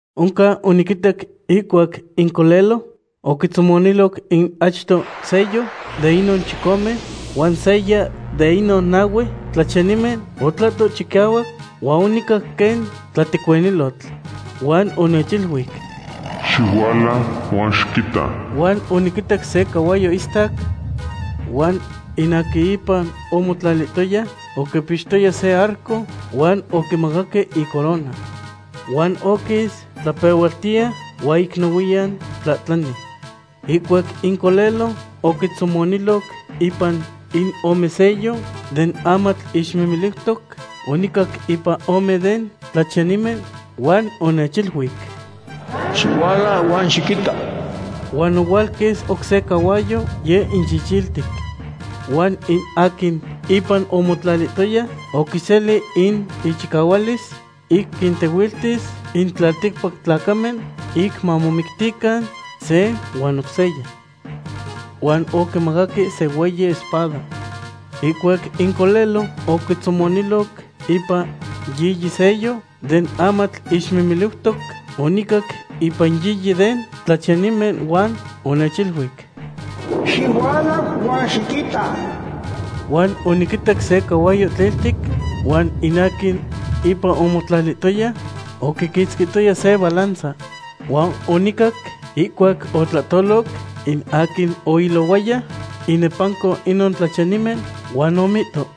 Oncan oniquitac ihcuac in Colelo oquitzomoniloc in achto sello de inon chicome, huan seya de inon nahue tlachiyanimen otlahto chicahuac huan onicac quen tlatecuinilotl. Huan onechiluic: ―¡Xihuala huan xiquita! Huan oniquitac se cahuayo istac. Huan in aquin ipan omotlalihtoya oquipixtoya se arco, huan oquimacaque icorona. Huan oquis tlapehualtiya huan ic nohuiyan tlahtlani. Ihcuac in Colelo oquitzomoniloc ipan in ome sello den amatl ixmimiliutoc, onicac ipan ome den tlachiyanimen huan onechiluic: ―¡Xihuala huan xiquita! Huan ohualquis oc se cahuayo, yeh in chichiltic. Huan in aquin ipan omotlalihtoya oquiseli in ichicahualis ic quintehuiltis in tlalticpac tlacamen ic mamomictican se huan oc seya. Huan oquimacaque se hueyi espada. Ihcuac in Colelo oquitzomoniloc ipan yiyi sello den amatl ixmimiliutoc, onicac ipan yiyi den tlachiyanimen huan onechiluic: ―¡Xihuala huan xiquita! Huan oniquitac se cahuayo tliltic, huan in aquin ipan omotlalihtoya oquiquitzquihtoya se balanza. Huan onicac ihcuac otlahtoloc in aquin oilohuaya inepanco inon tlachiyanimen huan omihto: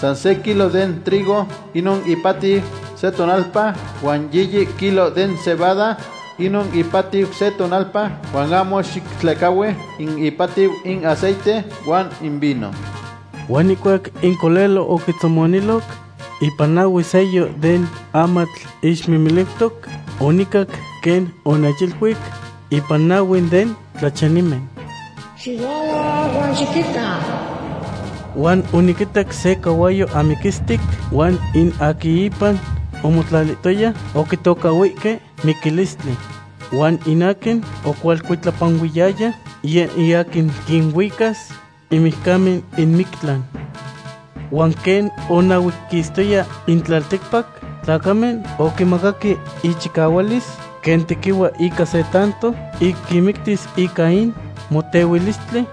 ―San se kilo den trigo inon ipatiu se tonalpa, huan yiyi kilo den cebada inon ipatiu se tonalpa, huan ahmo xitlehcahui in ipatiu in aceite huan in vino. Huan ihcuac in Colelo oquitzomoniloc ipan nahue sello den amatl ixmimiliutoc, onicac quen onechiluic ipan nahue den tlachiyanimen: ―¡Xihuala huan xiquita! Huan oniquitac se cahuayo amiquistic huan in aquin ipan omotlalihtoya oquitocahhuihque miquilistli. Huan in aquin ocualcuitlapanuiyaya, yeh in aquin quinuicas in mijcamen in mictlan. Huan quen onahuequistoya in tlalticpac tlacamen, oquimacaque ichicahualis quen tequihua ica se tanto ic quinmictis ica in motehuilistli,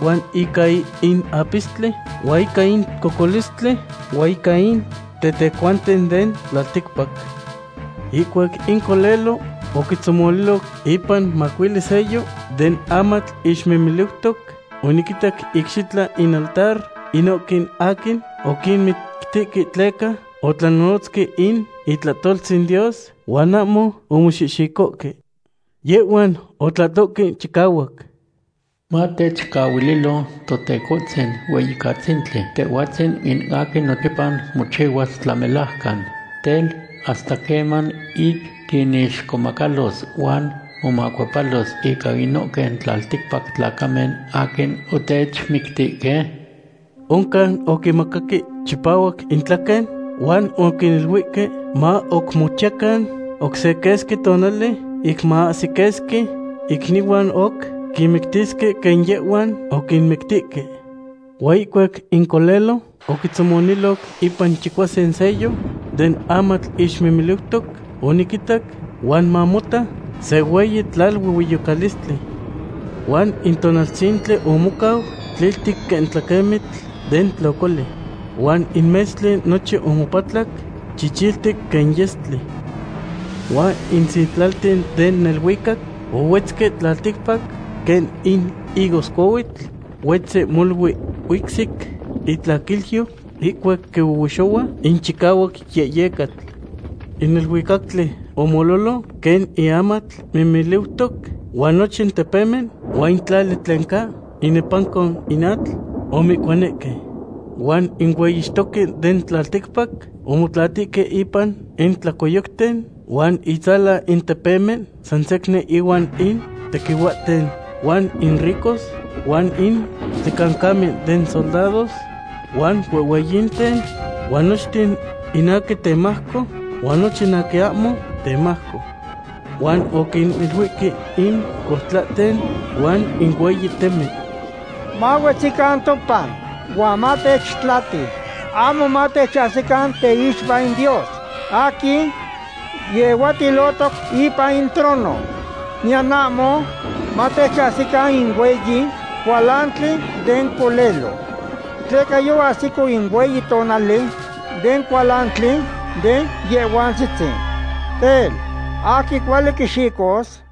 huan ica in apistli, huan ica in cocolistli, huan ica in tetecuanten den tlalticpac. Ihcuac in Colelo oquitzomoniloc ipan macuili sello den amatl ixmimiliutoc, oniquinitac icxitla in altar inohque aquin oquinmictihque tleca otlanonotzque in itlahtoltzin Dios huan ahmo omoxihxicohque. Yehhuan otlahtohque chicahuac: ―Matechcaquilo, Totecohtzin Hueyicatzintli, Tehhuatzin in aquin nochipa mochihuas tlamelajcan. Tel, ¿hasta queman ic quinixcomacalos huan momacuepalos ica inohque tlalticpac tlacamen aquin otechmictihque? Oncan oquinmacaque chipahuac intlaquen huan oquiniluihque ma oc mochiyacan oc se quesqui tonali ic ma ahsi quesqui icnihuan oc quinmictisque quen yehhuan oquinmictihque. Huan ihcuac in Colelo oquitzomoniloc ipan chicuasin sello den amatl ixmimiliutoc oniquitac, huan mamota, se hueyi tlaluehueyocalistli. Huan in tonaltzintli omocau tliltic quen tlaquemitl den tlocoli. Huan in metztli nochin omopatlac chichiltic quen yestli. Huan in sitlalten den neluicac ohuetzque tlalticpac, quen in higoscohuitl huetzi molui huicsic itlaquilyo ihcuac quihuehuexohua in chicahuac yehyecatl. In neluicactli omololo quen in amatl mimiliutoc huan nochin tepemen huan in tlali tlen ca inepanco in atl omoihcuanihque. Huan in hueyixtoque den tlalticpac omotlatihque ipan in tlacoyocten huan itzalan in tepemen, sansecnin ihuan in tequihuahten huan in ricos, huan in tlicancamen den soldados, huan huehhueyinten, huan nochten in aquin temajco huan nochin aquin ahmo temajco. Huan oquiniluihque in coutlahten huan in hueyi temen: ―Mahuetzican topan huan matechtlati, ahmo matechahsican teixpa in Dios aquin yehuatilohtoc ipan in trono, niyan ahmo matechahsican in hueyi cualantli den Colelo. Tleca yoahsico in hueyi tonali den cualantli den Yehhuantzitzin. Tel, ¿aquin cuali quixicos?